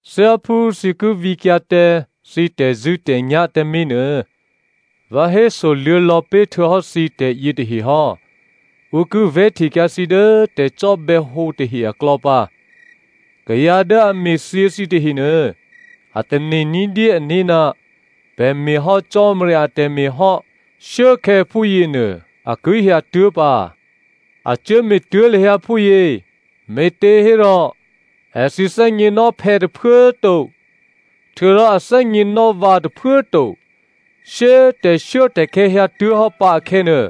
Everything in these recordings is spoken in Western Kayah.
“Thyáphú thǐ ki vǐkyǎ tǎ thǐ tè̤zṳ̂́tè̤nyá̤ tǎmé̤ nuô, vǎ hésoluô̌ lò̌pé̤ htuô̌hò́ thǐ tè̤yětahe hò́. Ǔ ki vè̤́htekyǎ thǐ dố tè̤cò́bè̌hǒ tahe aklò̌ pǎ. Kayǎ dố a me̤thyě thǐ tahenuô a tane̤ ní̤dyé ané̤, ‘Pè̤ me̤ hò́ Cò́marya atè̤me̤ hò́,’ shuốkhè̌ phúyěnuô, a ki hyǎtuố̤ pǎ. A cuố me̤tuố̤ lahyǎ phúyě me̤těhérò èthǐ thè́gněnò́ phè̌ tôphuố꤮ to, htuô̌rò a thè́gněnò́ vǎ tôphuố꤮ to. Shyé꤮ tè̤shuốtè̤khè̌ hyǎtuố̤hò́ pǎ akhè̌nuô,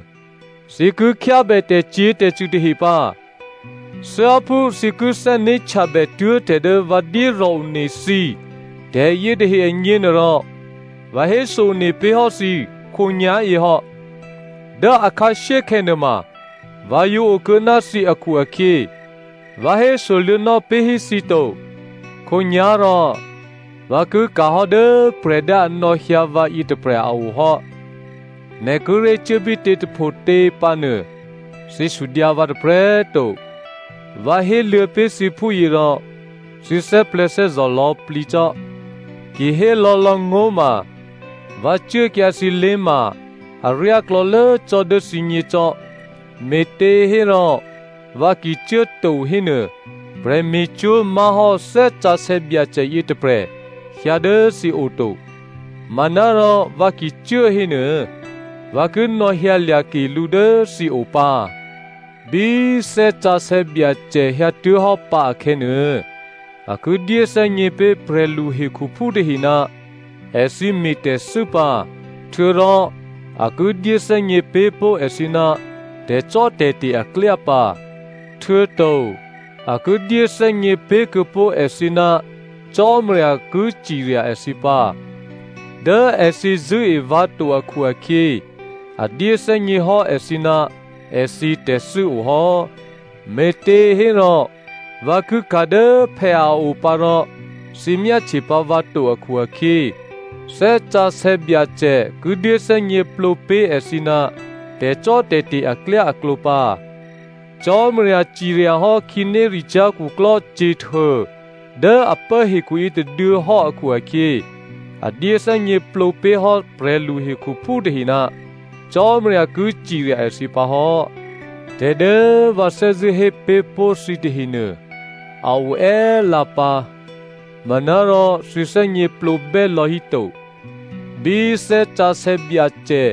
thǐ ki khyábè tè̤cyě̤tè̤cṳ̂ tahe pǎ. Thyáphú thǐ ki thè́né̤htyabè tuố̤ tè̤ dố vǎ dyérò̤ one thǐ tè̤yětahe agněnuôrò, vǎ héso-one pé̤ hò́ thǐ khǒnyá̤yě hò́. Dố akhǎshyékhè̌ nuôma vǎ yǒ okuô̌ ná thǐ akhu-akhyě vǎ hésoluô̌nò́ pé̤hí thǐ to.” “Khǒnyá̤rò, vǎ ki ka̤hò́ dố prè̤ dố a nò̌hyǎ vǎ yětôprè̤ a o hò́. ‘Nè̤ kíré̤ cuốbítě tôphotě pǎnuô,’ thǐ sudyǎ vǎ tôprè̤꤮ to. Vǎ héluô̌ pé̤ thǐ phúyě rò thǐ thè́plè̤̌thè́zò̤ lò̌plǐ cò́. Ki hé lò̌lò̌꤮ ngó̤ ma, vǎ cuốkyǎ thǐlé̤ ma aryá klò̌lố cò́ dố thǐgněcò́, me̤těhérò vǎ ki cuố to hénuô, prè̤me̤cwó̤ má̤hò́ Thè́ Sǎsè̌ Byacè yětôprè̤ hyǎ dố thǐo to. Manárò vǎ ki cuố hénuô, vǎ ki nò̌hyǎlya̤ ke lǔ dố thǐo pǎ. Bí Thè́ Sǎsè̌ Byacè hyǎtuố̤hò́ pǎ akhè̌nuô, a ki dyéthè́gně pé̤ prè̤lu hekhuphú tahe ná èthǐ me̤ tè̤thû́ pǎ, htuô̌rò a ki dyéthè́gně pé̤ pó̤ èthǐ ná tè̤cò́tè̤te̤ aklyá pǎ. Htuô̌to, a ki dyéthè́gně pé̤kuô̌pó̤ èthǐ ná Cò́marya ki cirya èthǐ pǎ. Dố èthǐ zṳ̂́e vǎ to akhu-akhyě, a dyéthè́gněhò́ èthǐ ná èthǐ tè̤thû́ o hò́. Me̤těhérò, vǎ ki ka̤ dố phè̌ a o pǎ rò thǐ myáhtye pǎ vǎ to akhu-akhyě, Thè́ Sǎsè̌ Byacè ki dyéthè́gněplǒ pé̤ èthǐ ná tè̤cò́tè̤te̤ aklyáaklǒ pǎ. Cò́marya ciryahò́ khǐnéricyá̤ khuklò́ Satan dố a pố hekhu yětôduô̌ hò́ akhu-akhyě, a dyé thè́gněplǒ pé̤hò́ prè̤lu hekhuphú tahe ná Cò́marya ki cirya èthǐ pǎ hò́. “Tè̤ dố vǎ thè́zṳ̂́ hé pé̤ pó̤ thǐ tahenuô a o è́lǎpǎ, manárò thǐ thè́gněplǒbè́ lò̌híto. Bí Thè́ Sǎsè̌ Byacè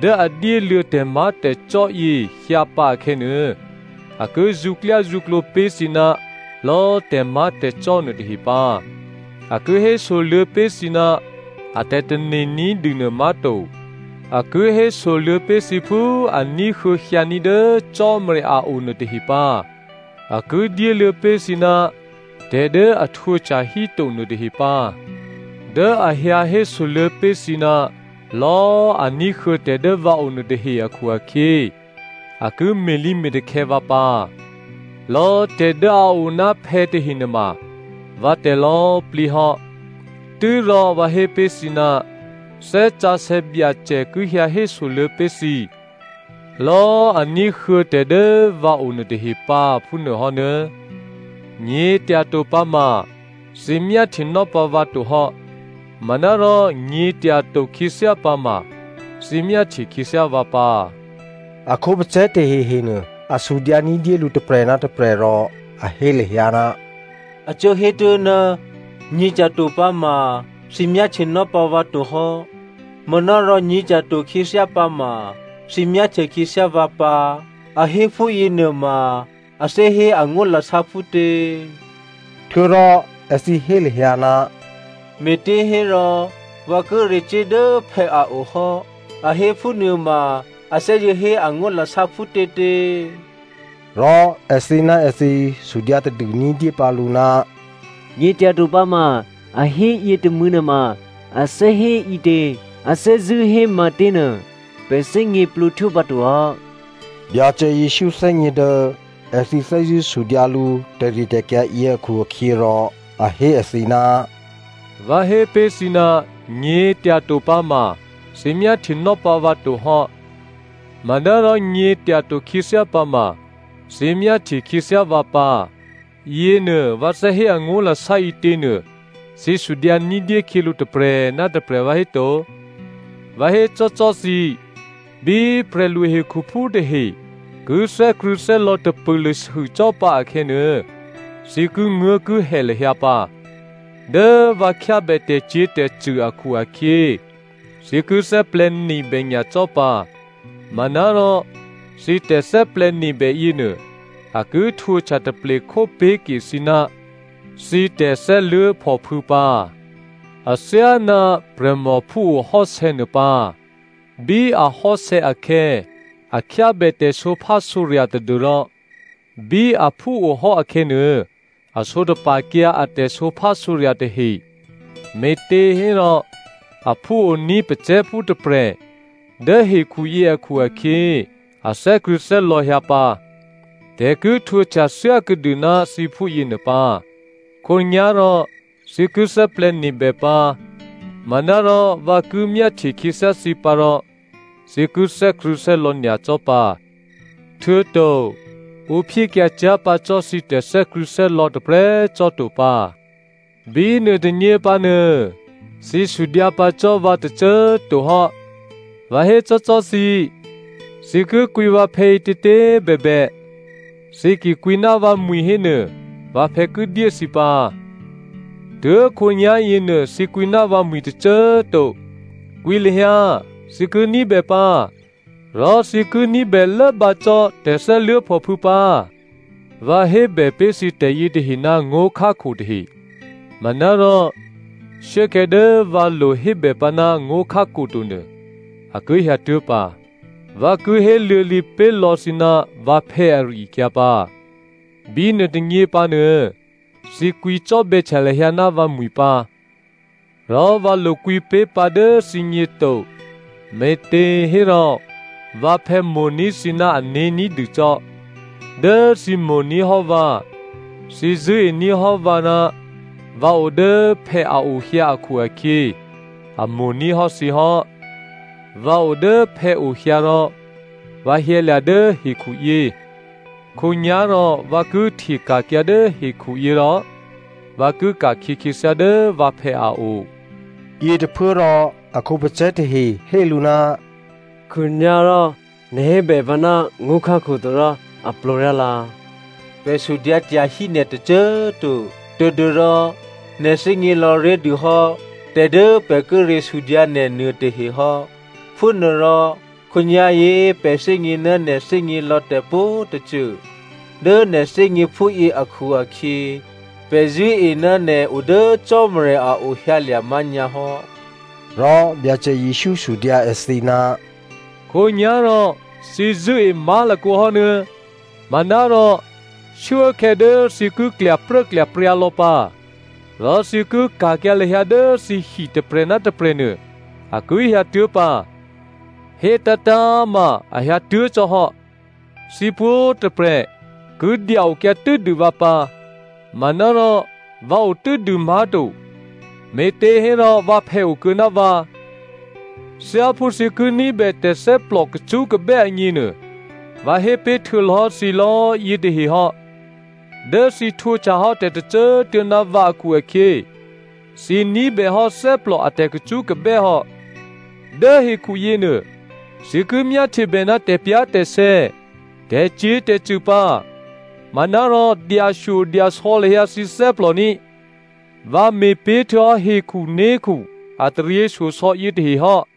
dố a dyéluô̌ tè̤má̤tè̤cò́ yě hyǎpǎ akhè̌nuô, a ki zṳ̌klyázṳ̌klǒ pé̤ thǐ ná lò̌ tè̤má̤tè̤cò́ nuôtahe pǎ. A ki hésoluô̌ pé̤ thǐ ná a tè̤tane̤ ní̤dûnuô má̤to. A ki hésoluô̌ pé̤ thǐ phú a ní̤huô̌ hyǎní̤ dố Cò́marya a o nuôtahe pǎ. A ki dyéluô̌ pé̤ thǐ ná tè̤ dố a htwǒhtya híto nuôtahe pǎ. Dố a hyǎ hésoluô̌ pé̤ thǐ ná lò̌ a ní̤huô̌ tè̤ dố vǎo nuôtahe akhu-akhyě, a ki me̤lǐme̤takhè̌ vǎ pǎ. Lò̌꤮ tè̤ dố a o ná phè̌ tahe nuôma vǎtè̤ lò̌꤮ plǐ hò́. Tû́rò vǎ hé pé̤ thǐ ná Thè́ Sǎsè̌ Byacè ki hyǎ hésoluô̌ pé̤ thǐ lò̌꤮ a ní̤huô̌ tè̤ dố vǎ o nuôtahe pǎ, phúnuô hò́nuô̌.” “Nyě̤tyato pǎma thǐ myáhtyenò́ pǎ vǎ to hò́, manárò nyě̤tyato khyěthyá pǎma thǐ myáhtye khyěthyá vǎ pǎ.” A khǒpacè̤̌ tahehe nuô, a sudyǎ ní̤dyé lǔ tôprè̤ ná tôprè̤ rò a hé lahyǎ, “A cuố hé tuố̤, ‘Nyě̤tyato pǎma thǐ myáhtyenò́ pǎ vǎ to hò́, manárò nyě̤tyato khyěthyá pǎma thǐ myáhtye khyěthyá vǎ pǎ’ a hé phúyěnuôma a thè́hé angó̤lasá phútě?” Htuô̌rò èthǐ hé lahyǎ, “‘Me̤těhérò vǎ kíré̤ cuố dố phè̌ a o hò́,’ a hé phúnuôma a thè́zṳ̂́ hé angó̤lasá phútětě?” Rò èthǐ ná èthǐ sudyǎ tadû ní̤dyé pǎlǔ, “‘Nyě̤tyato pǎma,’ a hé yětômû̌ nuôma a thè́hé ǐtě? A thè́zṳ̂́ hé matěnuô, pè̤ thè́gněplǒ htwópǎto hò́.” Byacè Jesǔ thè́gně dố èthǐ thè́zṳ̂́ sudyǎ lǔ tè̤ritè̤kyǎ yě akhu-akhyěrò a hé èthǐ, “Vǎ hé pé̤ thǐ, ‘Nyě̤tyato pǎma thǐ myáhtyenò́ pǎ vǎ to hò́, manárò nyě̤tyato khyěthyá pǎma thǐ myáhtye khyěthyá vǎ pǎ,’ yěnuô vǎ thè́ hé angó̤lasá ǐtěnuô thǐ sudyǎ ní̤dyé khyělǔ tôprè̤ ná tôprè̤ vǎhéto? Vǎ hécò́cò́ thǐ, bí prè̤lu hekhuphú tahe ki thè́krṳ̂̌thè́lò̌ tapûlûsû cò́ pǎ akhè̌nuô, thǐ kinguố̤kihè lahyǎ pǎ. Dố vǎ khyábè tè̤cyě̤tè̤cṳ̂ akhu-akhyě, thǐ ki thè́plè̤̌nebè nyacò́ pǎ, manárò thǐ tè̤thè́plè̤̌nebè yěnuô a ki htwǒhtya taplekhó pé̤ke thǐ ná thǐ tè̤thè́luố̤phòphû̌ pǎ. Athyáná prè̤mò phúo hò́sè̌ nuô pǎ. Bí a hò́sè̌ akhè̌, a khyábè tè̤sǒphásǒrya̤ tadû́rò bí aphúohò́ akhè̌nuô, a sǒtapa̤kyǎ a tè̤sǒphásǒrya̤ tahe, me̤těhérò aphúoní̤ pacè̤̌phú tôprè̤ dố hekhuyě akhu-akhyě a thè́krṳ̂̌thè́lò̌ hyǎ pǎ. Tè̤ ki htwǒhtya thyákuô̌dû ná thǐ phúyěnuô pǎ. Khǒnyá̤rò thǐ ki thè́plè̤̌nebè pǎ, manárò vǎ ki myáhtye khyěthyá thǐ pǎ rò thǐ ki thè́krṳ̂̌thè́lò̌ nyacò́ pǎ. Htuô̌to ǔ phyékyǎ cyá̤ pǎ cò́ thǐ tè̤thè́krṳ̂̌thè́lò̌ tôprè̤꤮ cò́to pǎ. Bínuôtônyě pǎnuô, thǐ sudyǎ pǎ cò́ vǎ tôcô꤮ to hò́. Vǎ hécò́cò́ thǐ, thǐ ki kwǐ vǎphè̌ ǐtětě꤮ bèbè, thǐ ki kwǐ ná vǎmwi̤ hénuô, vǎphè̌ ki dyé thǐ pǎ. Tuố̤khǒnyá̤ yěnuô, thǐ kwǐ ná vǎmwi̤ tôcô꤮ to. Kwǐ lahyǎ, thǐ ki ní̤bè pǎ. Rò thǐ ki ní̤bè lốbǎ cò́ tè̤thè́luố̤phòphû̌ pǎ. “Vǎ hébè pé̤ thǐ tè̤yětahe ná ngó̤khákho tahe. Manárò shuốkhè̌ dố vǎ lo hébè pǎ ná ngó̤khákho to nuô, a ki hyǎtuố̤ pǎ. Vǎ ki héluô̌lǐ pé̤lò̌ thǐ ná vǎphè̌ ari-akyǎ pǎ. Bínuôtônyě pǎnuô, thǐ kwǐcò́bè̌htya lahyǎ ná vǎmwi̤ pǎ. Rò vǎ lokwǐ pé̤ pǎ dố thǐgně to. Me̤těhérò vǎphè̌ mo̤ní̤ thǐ ná ané̤ ní̤dûcò́. Dố thǐ mo̤ní̤ hò́ vǎ, thǐ zṳ̂́ení̤ hò́ vǎ ná vǎ o dố phè̌ a o hyǎ akhu-akhyě, a mo̤ní̤ hò́ thǐ hò́. Vǎ o dố phè̌o hyǎ rò vǎ hyǎlya̤ dố hekhuyě. Khǒnyá̤rò vǎ ki hteka̤kyǎ dố hekhuyě rò vǎ ki ka̤khyě khyěthyá dố vǎphè̌ a o.” Yětôphuốrò a khǒpacè̤̌ tahe hé lǔ, “Khǒnyá̤ rò nè̤ hébè pǎ ná ngó̤khákho to rò a plǒryálǎ. Pè̤ sudyǎ tyahí nè̤ tôcô꤮ to tadû́rò nè̤ thè́gně lò̌ré̤dûhò́ tè̤ dố pè̤ kíré̤ sudyǎ nè̤ nuôtahe hò́. Phúnuôrò khǒnyá̤yě pè̤ thè́gně ná nè̤ thè́gně lò̌ tè̤pwǒ̤tôcô. Dố nè̤ thè́gně phúyě akhu-akhyě, pè̤ zṳ̂́e ná nè̤ o dố Cò́marya a o hyǎlya̤ má̤nyǎ hò́.” Rò Byacè Jesǔ sudyǎ èthǐ, “Khǒnyá̤rò thǐ zṳ̂́e má̤lakǒ hò́ nuô̌꤮? Manárò shuốkhè̌ dố thǐ ki klyapruốklyapryǎ lò̌ pǎ, rò thǐ ki ka̤kyǎ lahyǎ dố thǐhi tôprè̤ ná tôprè̤ nuô, a ki hyǎtuố̤ pǎ. Hétǎ̤tǎ̤꤮ ma a hyǎtuố̤ cò́hò́. Thǐ pwǒ̤꤮ tôprè̤ ki dya-okyǎ tû́dû vǎ pǎ. Manárò vǎ otû́dû má̤to, me̤těhérò vǎphè̌ okuô̌ ná vǎ. “Thyáphú thǐ ki ní̤bè tè̤thè́plò kacṳ́kabè́ agněnuô, vǎ hé pé̤ htuô̌ lò̌ hò́ thǐ lò̌꤮ yětahe hò́. Dố thǐ htwǒhtyahò́ tè̤tôcô꤮ tuô̌ ná vǎ akhu-akhyě, thǐ ní̤bèhò́ thè́plò a tè̤kacṳ́kabè́ hò́. Dố hekhu yěnuô, thǐ ki myáhtyebè ná tè̤pyá̤tè̤sè̌ tè̤cyě̤tè̤cṳ̂ pǎ, manárò dyashyodyasò̌ lahyǎ thǐ thè́plò ní꤮. Vǎ me̤pé̤ htuô̌hò́ hekhuné̤khu a taryěshyosò̌ yětahe hò́.”